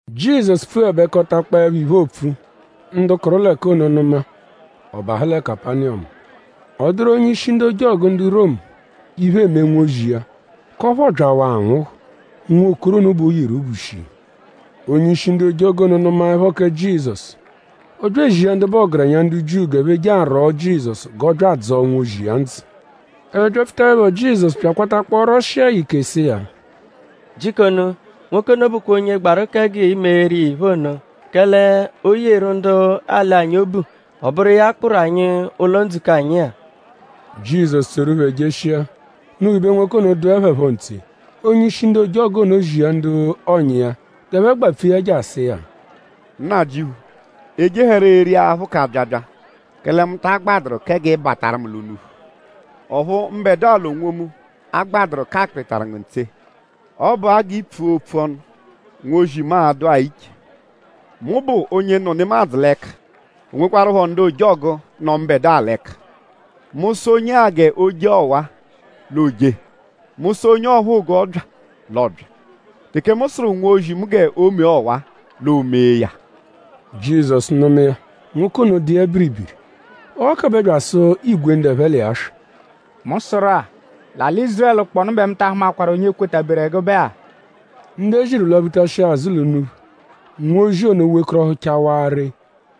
Jizọsu pfuẹbekotakpoepho iphe, oopfu; ndu kụru l'ẹka ono nụma; ọ bahụ lẹ Kapaniyọmu. Ọ dụru onye-ishi ndu ojọgu ndu Romu, iphe eme nwozi iya; k'ọphu ọobyawaa anwụhu. Nwokoro ono bẹ o yeru obu shii. Onye-ishi ndu ojọgu ono nụmaepho kẹ Jizọsu; ọ bya ezia ndu bụ ọgerenya ndu Jiu g'ẹphe je arwọo Jizọsu g'ọ bya adzọo nwozi iya ndzụ. Ẹphe byapfutaẹpho Jizọsu bya akwatakpọo rwọshia ya ike sụ iya: “Jikonu; nwoke ono bụkwa onye gbaru kẹ g'i meeru iya iphe ono; kẹle o yeru ndu alị anyi obu; ọ bụru iya kpụru anyi ụlo-ndzukọ anyi-a.” Jizọsu tsoru phẹ jeshia. Unuphu ibe nwoke ono dụe ya phọ ntse; onye-ishi ndu ojọgu ono zia ndu ọ̀nyà iya g'ẹphe gbapfu iya je asụ iya: “Nnajịuphu; e jehẹro eri aphụ k'abyabya; kẹle mu ta agbadụru kẹ g'ị bataru mu l'unuphu; ọphu mbẹdua l'onwomu agbadụru k'akpịritaru ngu ntse. Ọ bụa g'i pfua opfu ọnu; nwozi mu a-dụa iche. Mu bụ onye nọ nemadzụ l'ẹka; o nwekwarụpho ndu ojọgu, nọ mbẹdua l'ẹka. Mu -sụ onye-a g'o jee ọwa-a; l'o jee. Mu -sụ onye ọphuu g'ọ bya; l'ọ bya. Teke mu sụru nwozi mu g'o mee ọwa-a; l'o mee ya.” Jizọsu nụma iya; nwoke ono dụ iya biribiri. Ọ ghakọbe bya asụ igwe ndu ẹphe l'iya swị: “Mu sụru-a; l'alị Ízurẹlu kpọnu bẹ mu ta ahụmakwaru onye kwetaberu ẹgube-a.” Ndu e ziru lwaphutashia azụ l'unuphu; nwozi ono wekọrohuchawaa ree.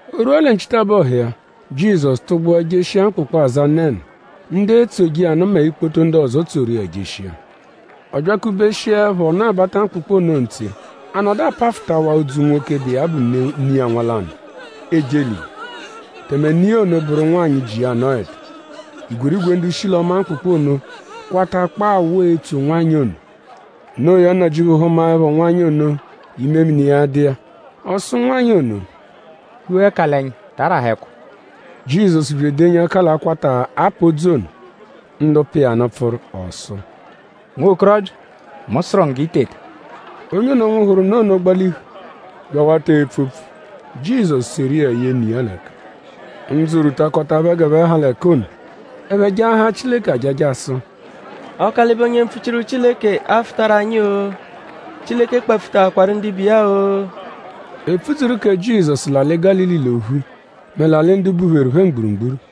O rwua lẹ nchitabọhu iya; Jizọsu tụgbua jeshia mkpụkpu, aza Nenu. Ndu etsoje iya nụ mẹ ikpoto ndu ọzo tsoru iya jeshia. Ọ byakubeshiẹpho ọnu-abata mkpụkpu ono ntse; a nọdu apafụtawaa odzu nwoke, bụ iya bụ ne iya nwa lanụ eje elili; tẹme ne iya ono bụru nwanyị, ji iya anọedu. Igwerigwe ndu shi l'ọma mkpụkpu ono kwatakpọo awụ etso nwanyị ono. Noo ya; Nnajịuphu hụmaepho nwanyị ono; imemini iya dụ iya. Ọ sụ nwanyị ono: “Hua ẹka l'ẹnya! Ta arahẹ ẹkwa!” Jizọsu bya edenyi ẹka l'akwata, a pa odzu ono. Ndu pa iya nụ pfụru. Ọ sụ: “Nwokorọbya; mu sụru ngu g'i teta!” Onye ono, nwụhuru nụ ono gbalihu bya awata epfu opfu. Jizọsu seru iya ye ne iya l'ẹka. Ndzụ rwutakọta phẹ g'ẹphe ha l'ẹka ono. Ẹphe jaahaa Chileke ajaja sụ: “Ọkalibe onye mpfuchiru Chileke afụtaru anyi-o! Chileke kpapfutaakwaru ndibe iya-o!” E pfudzuru kẹ Jizọsu l'alị Gálili l'ophu mẹ l'alị ndu bupheru phẹ mgburugburu.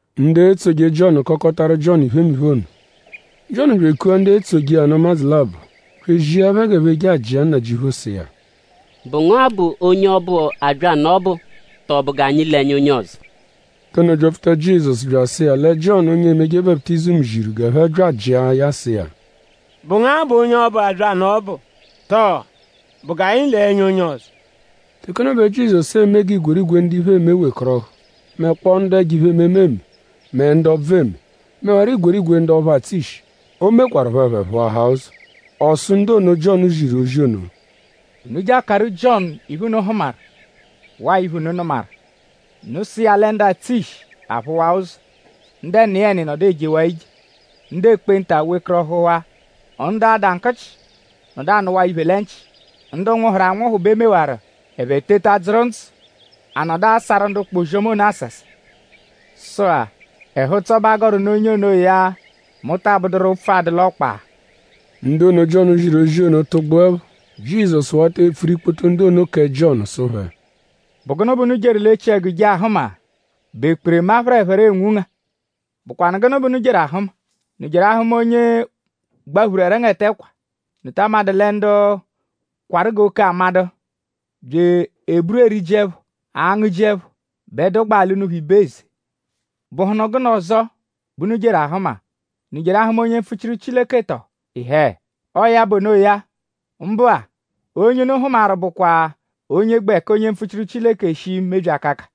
Ndu etsoje Jiọnu kọkotaru Jiọnu iphemiphe ono. Jiọnu bya ekua ndu etsoje iya nụ ụmadzu labọ bya ezia phẹ g'ẹphe je ajịa Nnajịuphu sụ iya: “?Bụ ngu-a bụ onye ọbu, abya nụ ọbu? Tọo?bụ g'anyi lee ẹnya onye ọzo?” Ndu ono byapfuta Jizọsu bya asụ iya lẹ Jiọnu onye emeje baputizimu ziru g'ẹphe bya ajịa ya sụ iya: “?Bụ ngu-a bụ onye ọbu abya nụ ọbu? Tọo?bụ g'anyi lee ẹnya onye ọzo?” Teke ono bẹ Jizọsu eme g'igwerigwe ndu iphe eme wekọrohu; mẹkpoo ndu ẹjo iphe-ememe eme; mẹ ndu ọbvu eme; mẹwaro igwerigwe ndu ọphu atsụ ishi, o mekwarụpho; ẹphe phụahaa ụzo. Ọ sụ ndu ono, Jiọnu ziru ozi ono: “Unu je akaru Jiọnu iphe, unu hụmaru; waa iphe, unu nụmaru. Unu sụ iya lẹ ndu atsụ ishi l'aphụwaa ụzo; ndu ẹniyeni nọdu ejewaa ije; ndu ekpenta wekọrohuwaa; ndu ada nkụchi nọdu anụwaa iphe lẹ nchị; ndu nwụhuru anwụhu bẹ e mewaru; ẹphe teta dzụru ndzụ; a nọdu asàru ndu ụkpa ozi-ọma ono àsàsà. Sụ-a; ẹhu-ụtso bẹ a gọru nụ onye onoya, mu taa bụduru ụpfu adụ l'ọkpa.” Ndu ono, Jiọnu ziru ozi ono tụgbuepho; Jizọsu wata epfuru ikpoto ndu ono kẹ Jiọnu sụ phẹ: “?Bụ gụnu bẹ unu jeru l'echiẹgu je ahụma??Bụ ekperema, phẹrephere enwunga? ?Bụkwanu gụnu bẹ unu jeru ahụma??Unu jeru ahụma onye gbaphuru ẹrengete ẹkwa??Unu ta amadụ lẹ ndu kwarụ g'oke-amadụ bya eburu eriji ẹpho; angụji ẹpho bẹ dụgbaa l'unuphu ibe eze? ?Bụhunu gụnu ọzo bẹ unu jeru ahụma??Unu jeru ahụma onye mpfuchiru Chileke tọo? Ịhee! Ọo ya bụ onoya! Mbụ-a; onye unu hụmaru bụkwa onye gbẹ ka onye mpfuchiru Chileke shii mebyi akaka.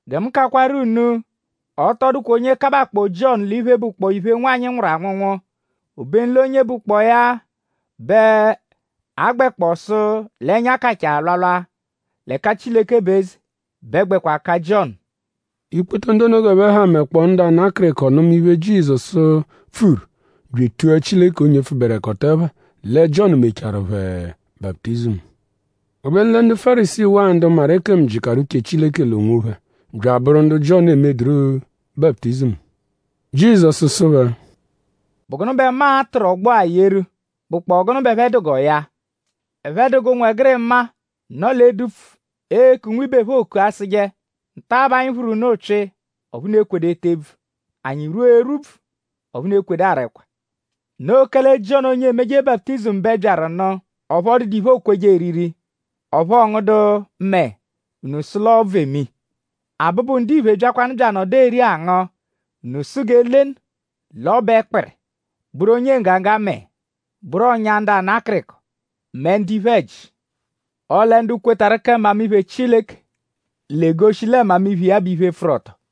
Gẹ mu kakwaru unu: ọ tọ dụkwa onye kabakpọo Jiọnu l'iphe, bụkpoo iphe, nwanyị nwụru anwụnwu; obenu l'onye bụkpoo ya bẹ a gbẹkpoo sụ l'ẹnya kachaa alwalwa l'ẹka Chileke bụ eze bẹ gbẹkwa ka Jiọnu.” Ikpoto ndu ono g'ẹphe ha mẹkpoo ndu ana akịriko nụma iphe, Jizọsu pfuru bya etua Chileke onye pfụberekoto ẹpha lẹ Jiọnu mecharu phẹ baputizimu. Obenu lẹ ndu Fárisii waa ndu maru ekemu jịkaru uche Chileke l'onwophẹ bya abụru ndu Jiọnu emeduru baputizimu. Jizọsu sụ phẹ: “?Bụ gụnu bẹ mu a-tụru ọgbo-a yeru; bụkpoo gụnu bẹ ẹphe dụ g'ọ ya? Ẹphe dụ g'ụnwegirima, nọ l'edupfu eku nwibe phẹ oku asụje: ‘Nta bẹ anyi phụru unu ụpyi; ọphu unu ekwedu ete ebvu. Anyi rwua erwubvu; ọphu unu ekwedu ara ẹkwa.’ Noo kẹle Jiọnu onye emeje baputizimu bẹ byaru nụ; ọphu ọ dụdu iphe, ookweje eriri; ọphu ọ ngụdu mẹe; unu sụ l'ọbvu eme iya. Abụbu-Ndiphe byakwanụ; bya anọdu eri angụ; unu sụ g'e lenu l'ọ bụ ẹkpiri; bụru onye nggaga mẹe; bụru ọ̀nyà ndu ana akịriko mẹ ndu iphe-ẹji. Ọle ndu kwetarụ kẹ mmamiphe Chileke; l'egoshi lẹ mmamiphe iya bụ iphe, pfụru ọto.”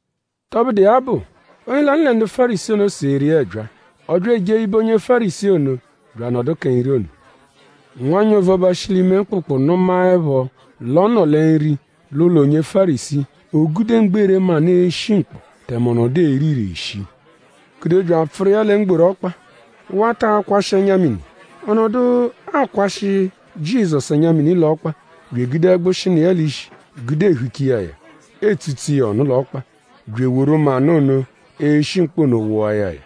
Tọbudu iya bụ; onye lanụ lẹ ndu Fárisii seeru iya ẹbyaa. Ọ bya eje ibe onye Fárisii ono bya anọdu kẹ nri ono. Nwanyị ovuọba, shi l'ime mkpụkpu nụmaepho l'ọ nọ lẹ nri l'ụlo onye Fárisii; o gude mgbere manụ, eshi mkpọ tẹme ọ nọdu ere ire shii gude bya apfụru iya lẹ mgboru ọkpa; wata akwashị ẹnya-mini. Ọ nọdu akwashị Jizọsu ẹnya-mini l'ọkpa bya egude ẹgbushi, nọ iya l'ishi gude ehucha iya ya; etsutsu iya ọnu l'ọkpa bya eworu manụ ono, eshi mkpọ ono wụa ya ya.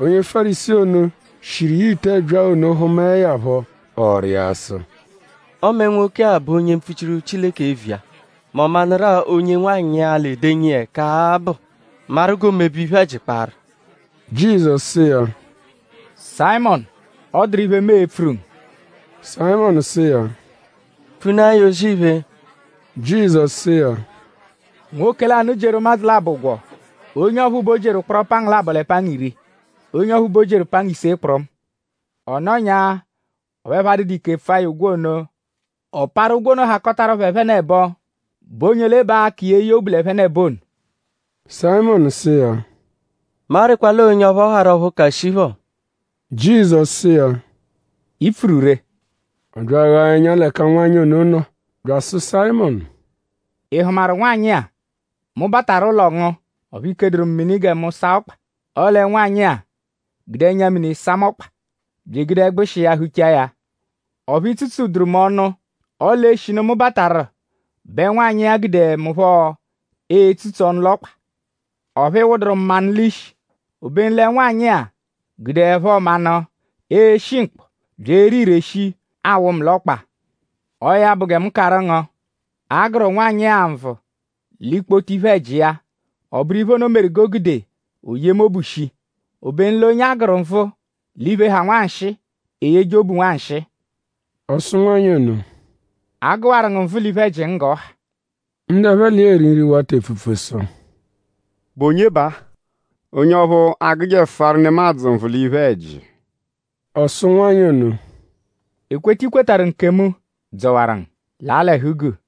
Onye Fárisii ono, shiru iya ite ẹbyaa ono hụmae ya phọ; ọ rịa sụ: “Ọme nwoke-a bụ onye mpfuchiru Chileke eviya; mẹ ọ manụrua onye nwanyị-a, l'edenyi iya ẹka-a bụ; maru g'oomebe iphe-ẹji kparụ.” Jizọsu sụ iya: “Sayịmonu; ọ dụru iphe, mu e-pfuru ngu.” Sayịmonu sụ iya: “Pfunaa ya; O-zì-iphe.” Jizọsu sụ iya: “Nwoke lanụ jieru ụmadzu labọ ụgwo. Onye ọphuu bẹ o jieru ụkporo pangu labọ lẹ pangu iri. Onye ọphuu bẹ o jieru pangu ise kpụrumu. Ọ nọnya; ọphu ẹphe adụdu ike pfụa ya ụgwo ono. Ọ parụ ụgwo ono hakọtaru phẹ ẹphenebo.?Bụ onye ole bẹ a-ka iya eye obu l'ẹphenebo ono?” Sayịmonu sụ iya: “Mu arịkwa l'ọo onye ọphu ọ harụ ọphu ka shii phọ.” Jizọsu sụ iya: “I pfuru ree!” Ọ bya aghaa ẹnya l'ẹka nwanyị ono nọ bya asụ Sayịmonu: “?Ị hụmaru nwanyị-a? Mu bataru ụlo ngu; ọphu i keduru mu mini gẹ mu saa ọkpa; ọle nwanyị-a gude ẹnya-mini saa mu ọkpa; bya egude ẹgbushi iya huchaa ya. Ọphu i tsutsuduru mu ọnu; ọle eshinu mu bataru bẹ nwanyị-a gudeẹ mu phọ etsutsu ọnu l'ọkpa. Ọphu ị wụduru mu manụ l'ishi. Obenu lẹ nwanyị-a gudeẹpho manụ, eshi mkpọ; bya ere ire shii, awụ mu l'ọkpa. Ọo ya bụ gẹ mu karụ ngu: a gụru nwanyị-a nvụ l'ikpoto iphe-ẹji iya. Ọ bụru iphe ono meru g'o gude o yee mu obu shii. Obenu l'onye a gụru nvụ l'iphe, ha nwanshịi; eyeje obu nwanshịi.” Ọ sụ nwanyị ono: “A gụwaru ngu nvụ l'iphe-ẹji ngu g'ọ ha.” Ndu ẹphe l'iya eri nri wata epfupfu sụ: “?Bụ onye baa? Onye ọphu agụjefuaru nemadzụ nvụ l'iphe-ẹji.” Ọ sụ nwanyị ono: “Ekweta, i kwetarụ nkemu dzọwaru ngu. Laa l'ẹhu-guu.”